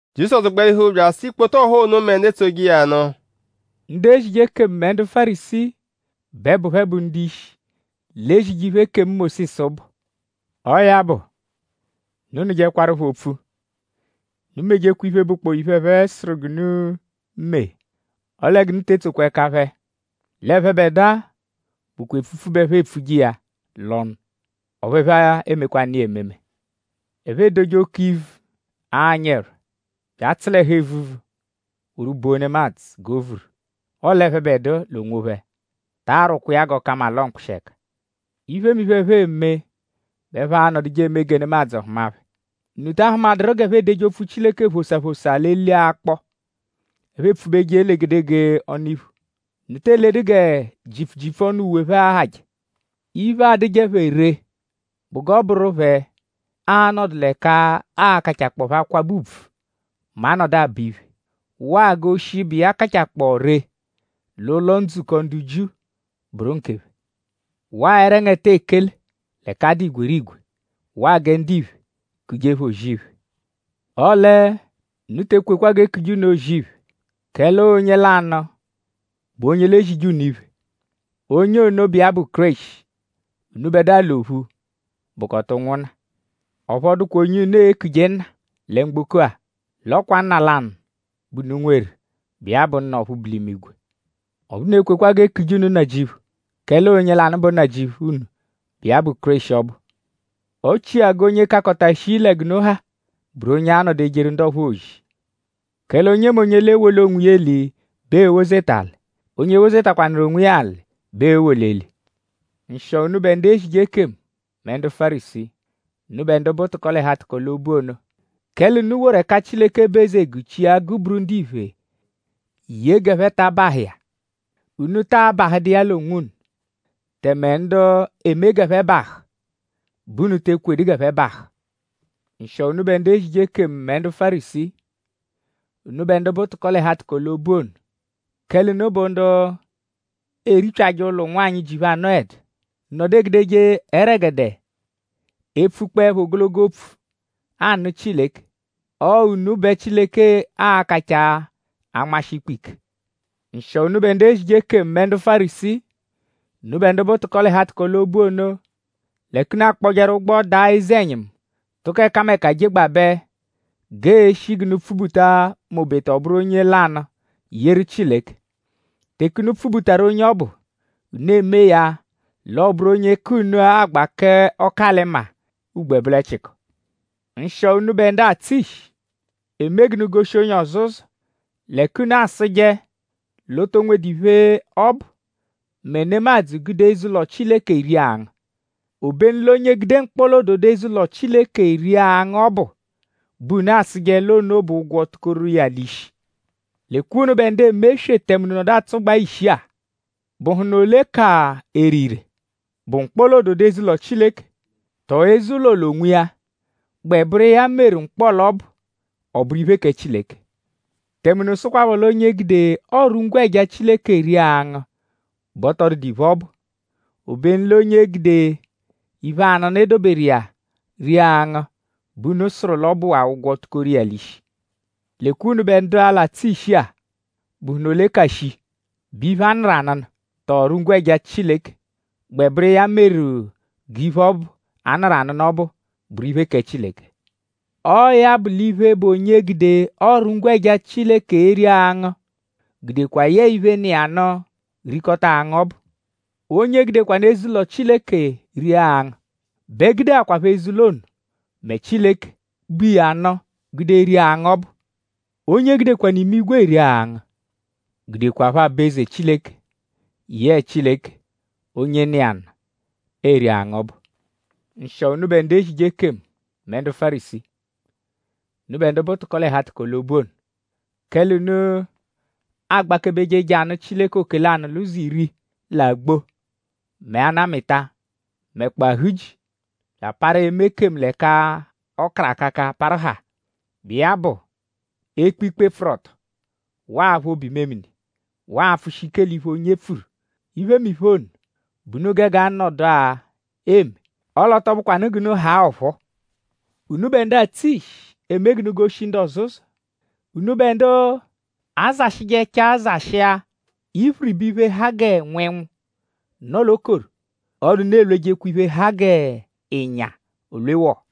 Jizọsu gbalihu bya asụ ikpoto ọha ono mẹ ndu etsoje iya nụ: “Ndu ezije ekemu mẹ ndu Fárisii bẹ bụ phẹ bụ ndu-ishi, l'ezije iphe, ekemu Mósisu bụ. Ọo ya bụ; unu nụjekwaru phẹ opfu. Unu mejekwa iphe, bụkpoo iphe, ẹphe sụru g'unu mee; ọle g'unu te etsokwa ẹka phẹ. L'ẹphebedua bụkwa epfupfu bẹ ẹphe epfuje iya l'ọnu; ọphu ẹphe emekwanụ iya ememe. Ẹphe edoje oke ivu, anyị ẹrwa; bya atsụ l'ẹhu evuvu woru bo nemadzụ g'o vuru; ọle ẹphebedua l'onwophẹ taa rwụkwa iya g'ọ ka mma l'ọo mkpụshi ẹka. Iphemiphe, ẹphe eme bẹ ẹphe anọduje eme gẹ nemadzụ hụma phẹ.?Unu ta ahụmaduru g'ẹphe edeje opfu Chileke phosaa phosaa l'eli akpọ, ẹphe epfubeje l'egedegee ọnu-iphu.?Unu te eledu gẹ jipfu jipfu ọnu uwe phẹ ahajẹ. Iphe, adụje phẹ ree bụ g'ọ bụru phẹ a-nọdu l'ẹka aa-kachakpọo phẹ akwabẹ ùbvù mẹ a -nọdu abọ iphe; waa g'oshi, bụ iya kachakpọo ree l'ụlo-ndzukọ ndu Jiu bụru nkephẹ; waa ẹrengete ekele l'ẹka a dụ igwerigwe; waa gẹ ndiphe kuje phẹ ‘O-zì-iphe’. Ọle unu te ekwekwa g'e kuje unu O-zì-iphe; kẹle ọo onye lanụ bụ onye l'ezije unu iphe. Onye ono bụ iya bụ Kéreshi. Unubẹdua l'ophu bụkota ụnwunna. Ọphu ọ dụkwa onye unu e-kuje Nna lẹ mgboko-a; l'ọ kwa Nna lanụ bẹ unu nweru, bụ iya bụ Nna ọphu bu l'imigwe. Ọphu unu ekwekwa g'e kuje unu Nnajịuphu; kẹle ọo onye lanụ bụ Nnajịuphu unu, bụ iya bụ Kéreshi ọbu. Ọ chia g'onye kakọta shii lẹ g'unu ha bụru onye a-nọdu ejeru ndu ọphuu ozi. Kẹle onyemonye, l'ewoli onwiya eli bẹ ee-wozeta alị. Onye wozetakwanụru onwiya bẹ ee-woli eli.” “Nshịo unubẹ ndu ezije ekemu mẹ ndu Fárisii! Unubẹ ndu bụ tụko-l'ẹhu-atụko-l'obu ono. Kẹle unu woru ẹka Chileke bụ eze guchia; guburu ndiphe ye g'ẹphe ta abahụ iya. Unu taa bahụdu iya l'onwunu; tẹme ndu eme g'ẹphe bahụ bẹ unu te ekwedu g'ẹphe bahụ. “Nshịo unubẹ ndu ezije ekemu mẹ ndu Fárisii! Unubẹ ndu bụ tụko-l'ẹhu-atụko-l'obu ono. Kẹle unu bụ ndu eripyajẹ ụlo ụnwanyi, ji phẹ anọedu. Unu nọdu egudeje ẹregede epfukpọepho ogologo opfu anụ Chileke. Ọo unu bẹ Chileke a-kachaa anmashi ikpe ike. “Nshịo unubẹ ndu ezije ekemu mẹ ndu Fárisii! Unubẹ ndu bụ tụko-l'ẹhu-atụko-l'obu ono. L'ẹka unu akpọjeru ụgbo daa eze-ẹnyimu tụko ẹkameka jegbabẹ g'ee-shi g'unu pfubuta m'obeta ọ bụru onye lanụ yeru Chileke. Teke unu pfubutaru onye ọbu; unu emee ya l'ọo-bụru onye ka unu agba k'ọku-alị-maa ugbo ẹbolechiko. “Nshịo unubẹ ndu atsụ ishi, eme g'unu goshi onye ọzo ụzo. L'ẹka unu asụje l'o to nwedu iphe, ọ bụ mẹ nemadzụ -gude eze-ụlo Chileke ria angụ. Obenu l'onye gude mkpọla-ododo eze-ụlo Chileke ria angụ ọbu bẹ unu asụje l'ono bụ ụgwo, tukoru iya l'ishi. Lekwa unubẹ ndu eme eswe tẹme unu nọdu atsụgbaa ishi-a!?Bụhunu ole ka ere ire??Bụ mkpọla-ododo eze-ụlo Chileke; tọo eze-ụlo l'onwiya, gbẹ bụru iya meru mkpọla ọbu ọ bụru iphe kẹ Chileke? Tẹme unu sụkwapho l'onye gude ọru-ngwẹja Chileke ria angụ bẹ ọ tọ dụdu iphe, ọ bụ; obenu l'onye gude iphe-anụnu, e doberu iya ria angụ bẹ unu sụru l'ọ bụwaa ụgwo, tukoru iya l'ishi. Lekwa unubẹ ndu-a, l'atsụ ishi-a!?Bụhunu ole ka shii??Bụ iphe, a nụru anụnu; tọo ọru-ngwẹja Chileke, gbẹ bụru iya meru g'iphe ọbu, a nụru anụnu ọbu bụru iphe kẹ Chileke? Ọo ya bụ l'iphe, bụ onye gude ọru-ngwẹja Chileke eri angụ gudekwa yẹe iphe, nọ iya nụ rikọta angụ ọbu. Onye gudekwanụ eze-ụlo Chileke ria angụ bẹ gudekwaphọ eze-ụlo ono mẹ Chileke, bu iya nụ gude ria angụ ọbu. Onye gudekwanụ imigwe eri angụ gudekwaphọ aba-eze Chileke yẹe Chileke, onye nọ iya nụ eri angụ ọbu. “Nshịo unubẹ ndu ezije ekemu mẹ ndu Fárisii! Unubẹ ndu bụ tụko-l'ẹhu-atụko-l'obu ono. Kẹle unu agbakebeje je anụ Chileke oke-lanụ-l'ụzo-iri l'agbo mẹ anamịta; mẹkpoo ahuji; bya aparu eme ekemu l'ẹka ọ karụ akaka parụ haa, bụ iya bụ ekpe ikpe, pfụru ọto; waa aphụ obu-imemini; waa apfụshi ike l'iphe, onye pfuru. Iphemiphe ono bẹ unu gege anọdua eme; ọle ọ tọ bụkwanu g'unu haa ọphuu. Unubẹ ndu atsụ ishi, eme g'unu goshi ndu ọzo ụzo; unubẹ ndu azashịjechaa zashịa iphiriba iphe, ha gẹ nwẹnwu, nọ l'okoro; ọle unu elwejekwa iphe, ha g'ịnya olwe wọo.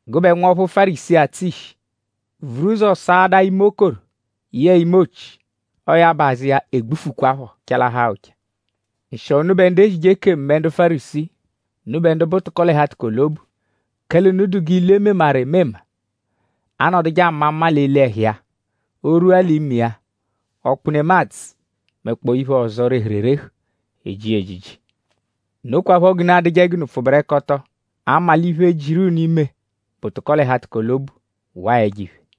Gụbe nwọphu Fárisii, atsụ ishi; vuru ụzo saadaa ime okoro yẹe ime ochi; ọo ya bụ; azụ iya egbufukwaphọ chalahaa ụcha. “Nshịo unubẹ ndu ezije ekemu mẹ ndu Fárisii! Unubẹ ndu bụ tụko-l'ẹhu-atụko-l'obu. Kẹle unu dụ g'ilu, e memaru emema, anọduje ama mma l'eli ẹhu iya; o -rwua l'ime iya; ọkpu nemadzụ; mẹkpoo iphe ọzo, rehuru erehu; eji iya ejiji. Nokwaphọ g'unu adụje g'unu pfụberekoto; 'ama l'iphe, jiru unu ime bụ tụko-l'ẹhu-atụko-l'obu waa ẹjo-iphe.”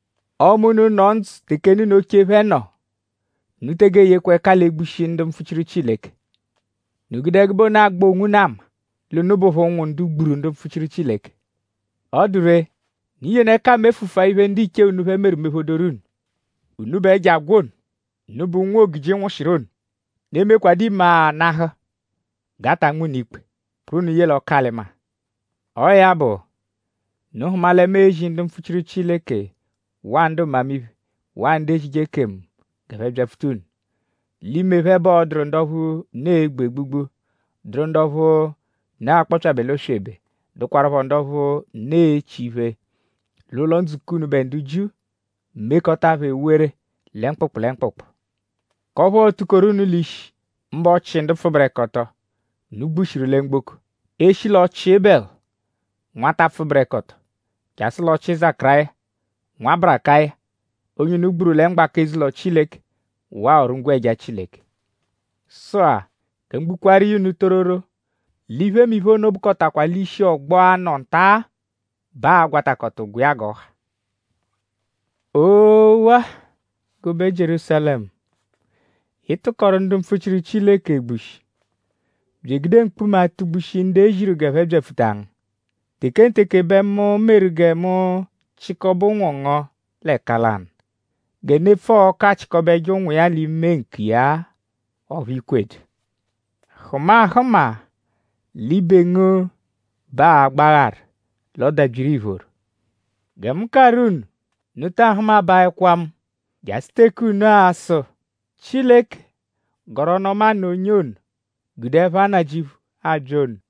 ‘Ọme unu nọ ndzụ teke nna unu oche phẹ nọ; unu tege eyekwa ẹka l'egbushi ndu mpfuchiru Chileke.’ Unu gude ẹgube ono agba onwunu ama l'unu bụpho ụnwu ndu gburu ndu mpfuchiru Chileke. Ọ dụ ree; unu yenu ẹka mefụfu-a iphe, ndiche unu phẹ meru mephodoru unu. Unubẹ ẹjo agwọ ono! Unubẹ ụnwu, ogiji nwụshiru ono!?Unu e-mekwadụ imagha nahụ g'a ta nma unu ikpe; kpụru unu ye l'ọku-alị-maa? Ọo ya bụ; unu hụma lẹ mu e-zi ndu mpfuchiru Chileke waa ndu mmamiphe; waa ndu ezije ekemu g'ẹphe byapfuta unu. L'ime phẹ bẹ ọ dụru ndu ọphu unu e-gbu egbugbu; dụru ndu ọphu unu a-kpọpyabe l'oswebe; dụkwarupho ndu ọphu unu e-chi iphe l'ụlo-ndzukọ unubẹ ndu Jiu; mekọta phẹ ewere lẹ mkpụkpu lẹ mkpụkpu; k'ọphu ọo-tukoru unu l'ishi; mbụ ọchi ndu pfụberekoto, unu gbushiru lẹ mgboko e -shi l'ọchi Ebẹlu; nwata pfụberekoto; jasụ l'ọchi Zakaráya; nwa Barakaya; onye unu gburu lẹ mgbaka eze-ụlo Chileke; waa ọru-ngwẹja Chileke. Sụ-a; gẹ mu gbukwaaru iya unu tororo; l'iphemiphe ono bụkotakwa l'ishi ọgbo-a, nọ nta-a bẹ aa-gwatakọta ụgwo iya g'ọ ha.” “Oowaa! Gụbe Jierúsalẹmu! Ị tụkoru ndu mpfuchiru Chileke egbushi; bya egude mkpuma atụ-gbushi ndu e ziru g'ẹphe byapfuta ngu. Tekenteke bẹ mu meru gẹ mu chịkobe ụnwu ngu l'ẹka lanụ gẹ nepfu-ọku achịkobeje ụnwu iya l'ime ǹkù iya-a; ọphu i kwedu! Hụma ahụma; l'ibe ngu bẹ aa-gbagharu; l'ọ dabyiru iphoro. Gẹ mu karụ unu; unu ta ahụmabaekwa mu jasụ teke unu a-sụ: ‘Chileke gọru ọnu-ọma nụ onye ono, gude ẹpha Nnajịuphu abya ono.’”